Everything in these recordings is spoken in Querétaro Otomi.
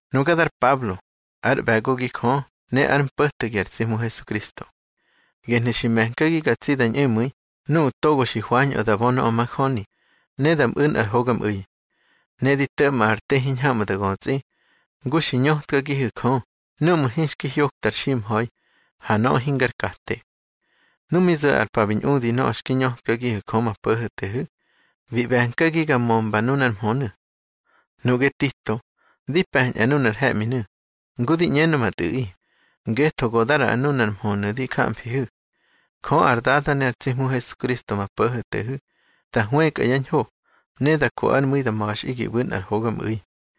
Nuga dar Pablo, ár ꞌbe̱gogi Jö ne ár mpo̱tegi ar tsi Hmu Hesukristo. Gehnu̱ xi me̱nkagi ga tsi da ñꞌemu̱i nuꞌu̱ togo xi hwañꞌö da bö nöꞌö majöni, ne da mꞌu̱ nꞌar hogamꞌu̱i. Ne di to̱ꞌma ar te hiñhamꞌu̱ da götsꞌi, ngu xi ñötkagihu̱ Jö núꞌmu̱ hinxki hyokta ar ximha̱i, ha nöꞌö hingar kate. Nu mi zo̱ ar pa bi ñꞌudi nöꞌö xki ñötkagihu̱ Jö ma Po̱ho̱tehu̱, bi ꞌbe̱nkagi ga mömba nunár mhönu̱. Nuꞌge Tito, di pe̱ñꞌa nunar he̱ꞌminu̱, ngu di ꞌñenö ma tꞌu̱ꞌi, ngetho go da ꞌraꞌa nunar mhönu̱ di jamfihu̱. Jö ar Dada ne ar tsi Hmu Hesukristo ma Po̱ho̱tehu̱, da hwëkꞌa yá ñho, ne da ko ár mu̱i da ma̱xꞌi gi ꞌbu̱ nꞌar hogamꞌu̱i.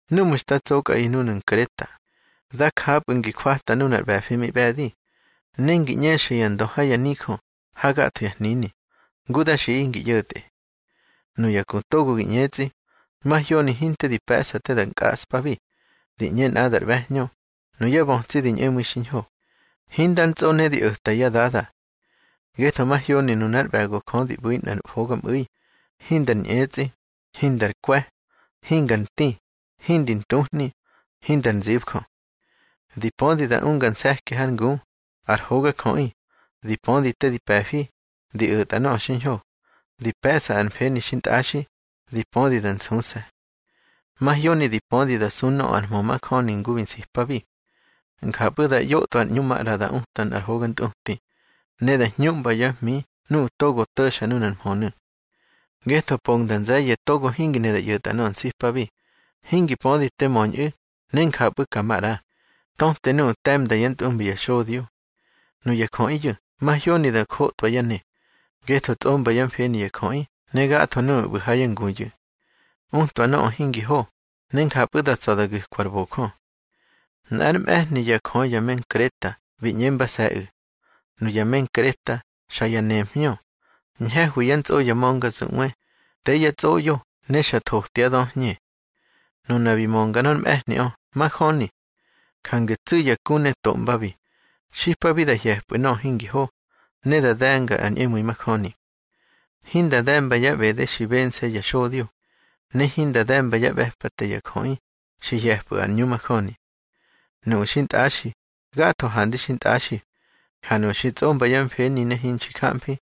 Núꞌmu̱ nda tsokꞌaꞌi núnu̱ Nkreta, da japꞌu̱ ngi jwata nunar ꞌbe̱fi mi ꞌbe̱di, ne ngi ꞌñexa ya ndö ha ya nijö ha gatho ya hnini, ngu da xiꞌaꞌi ngi ꞌyo̱tꞌe. Nuya ku togo gi ꞌñetsꞌi, mahyoni hinte di pe̱ꞌsa te da nkꞌaꞌspabi, di ꞌñe nꞌadar ꞌbe̱hñö, nuyá bötsi di ñꞌemu̱i xiñho, hindar ntsꞌo ne di o̱ta yá dada. Ngetho mahyoni nunár ꞌbe̱go Jö di ꞌbu̱ nꞌar hogamꞌu̱i, hindar ñꞌetsꞌi, hindar kwe̱, hingar nti, hindi ntuhni, hindar nzibjö. Di pödi da unga nse̱ki hár ngu, ar hogajöꞌi, di pödi te di pe̱fi, di o̱tꞌa nöꞌö xiñho, di pe̱ꞌsa ar mfeni xintꞌaxi, di pödi da nsuse̱. Mahyoni di pödi da su nöꞌö ar mhö majöni ngu bi nsipabi. Njapꞌu̱ da ꞌyotꞌwa ar ꞌñu maꞌra di uta nꞌar hoga ntꞌuti, ne da hñuꞌmba yá hmi nuꞌu̱ togo to̱xa nunar mhönu̱. Ngetho pongda nze̱ye̱ togo hingi ne da ꞌyo̱tꞌa nöꞌö nsipabi, hingi pödi te möñꞌu̱ ne njapꞌu̱ ka maꞌra, töte nuꞌu̱ te̱mda yá ntꞌumbi ya xodyo. Nuya jöꞌiyu̱ mahyoni da jotwa yá ne, ngetho tsꞌomba yá mfeni ya jöꞌi ne gatho nuꞌu̱ ꞌbu̱ ha yá nguyu̱. Utwa nöꞌö hingi ho, ne njapꞌu̱ da tsa̱ da gu̱kwa ar bojö. Nꞌár mꞌe̱hni yá jö ya me Nkreta bi ꞌñembase̱ꞌu̱: Nuya me Nkreta, xa ya nemhñö, ñhe̱hwi yá ntsꞌo ya ma̱ngazuꞌwe, te yá tsꞌoꞌyo ne xa thotyá döhñe. Nuna bi mönga nor mꞌe̱hniꞌö, majöni. Jange tsu̱ ya ku ne toꞌmbabi, xipabi da hye̱pꞌu̱ nöꞌö hingi ho, ne da de̱nga ar ñꞌemu̱i majöni. Hinda de̱mba yá ꞌbede xi bense̱ ya xodyo, ne hinda de̱mba yá ꞌbe̱pate ya jöꞌi xi hye̱pꞌu̱ ar ꞌñu majöni. Nuꞌu̱ xintꞌaxi, gatho handi xintꞌaxi, ha nuꞌu̱ xi ntsꞌomba yá mfeni ne hinxi jamfi,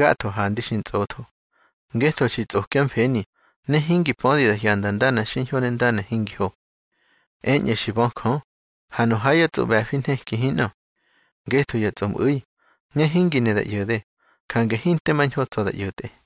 gatho handi xi ntsꞌotho, ngetho xi tsꞌokyá mfeni, ne hingi pödi da hyanda ndana xiñho ne ndana hingi ho. Eñꞌu̱ xi bö Jö, ha nu ha yá tsꞌoꞌbe̱fi nheki hinꞌö. Ngetho ya tsꞌomꞌu̱i, ne hingi ne da ꞌyo̱de, jange hinte mañho tsa̱ da ꞌyo̱tꞌe.